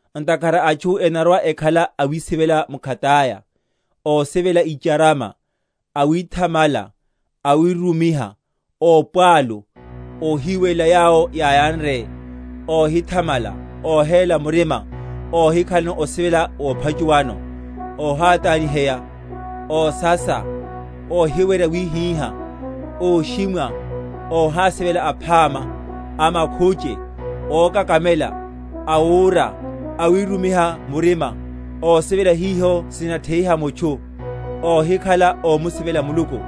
Ntakhara atchu enarwa‐ekhala awisivela mkhataya, ósivela icharama, awithamala, awirumiha, ópwalu, óhiwiwelela yawo yáyanre, óhithamala, óhéla murima, óhikhalano osivela wophachuwano, óhátányiheya, ósasa, óhiwerya wíhíha, óshimwa, óhásivela aphama, amakhuche, ókakamela, awúra, awirumiha murima, ósivela hiho sinatheiha mutchu, óhikhala ómusivela Muluku;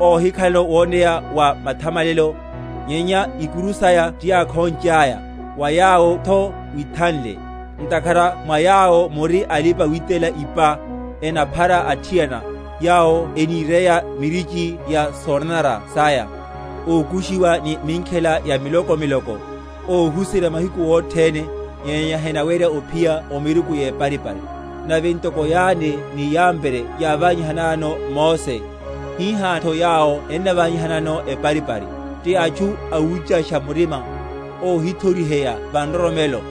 óhikhalano woneya wa mathamalelo, nyenya ikuru saya tiyákhonchaya; wa yawotho withanle. Ntakhara mwa yawo muri alipa‐witela ipa, enaphara athiana, yawo eníreya mirichi ya sonanara saya, ókushiwa ni minkhela ya miloko miloko; óhuserya mahiku othene, nyenya henaweryaru ophiya o miruku yeparipari. Nave ntoko Yane ni Yambre yáványannayano Mose, hihatho yawo ennaványanano eparipari; ti atchu awúchasha murima, óhithoriheya va nroromelo.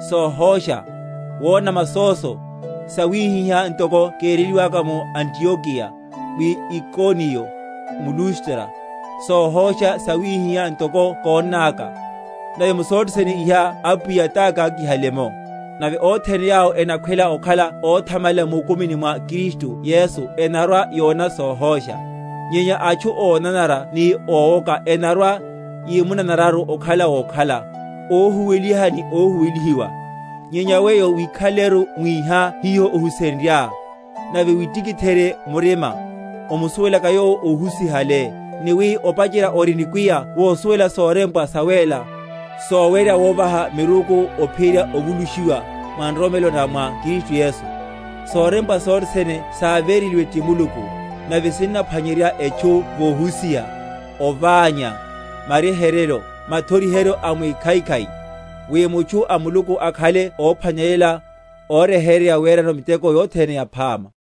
sohósha, wona masóso; sawihiha ntoko kéreliwaka mu Antiokeya, mu Ikoniya, m’Lustro, sohósha sawihiha ntoko kónnaka; nave mu sothe sene iha Apwiya tákákihaliye’mo. Nave othene yawo enakhwela okhala óthamalela mukumini mwa Kristu Yesu enarwa‐yona sohósha. Nyenya atchu ónanara ni ówoka, enarwa‐yimunanararu okhala wokhala, óhuweliha ni óhuwelihiwa. Nyenya weyo wikhaleleru mwíha hiho ohusenryá, nave witikitheryeno murima, omusuwelaka yowo óhusihale; ni wi opacherya ori nikwiya wosuwela sorempwa sawéla, sowerya wóvaha miruku ophiyerya ovulushiwa, mwa nroromelo na mwa Kristu Yesu. Sorempwa sothene sávereliwe ti Muluku, nave sinnaphwanyerya etchu vohusiha, oványa, maryeheryo, mathoriheryo a wikhaikhai: wi mutchu a Muluku akhale óphwanelela, óryeheryeya werano miteko yothene yaphama.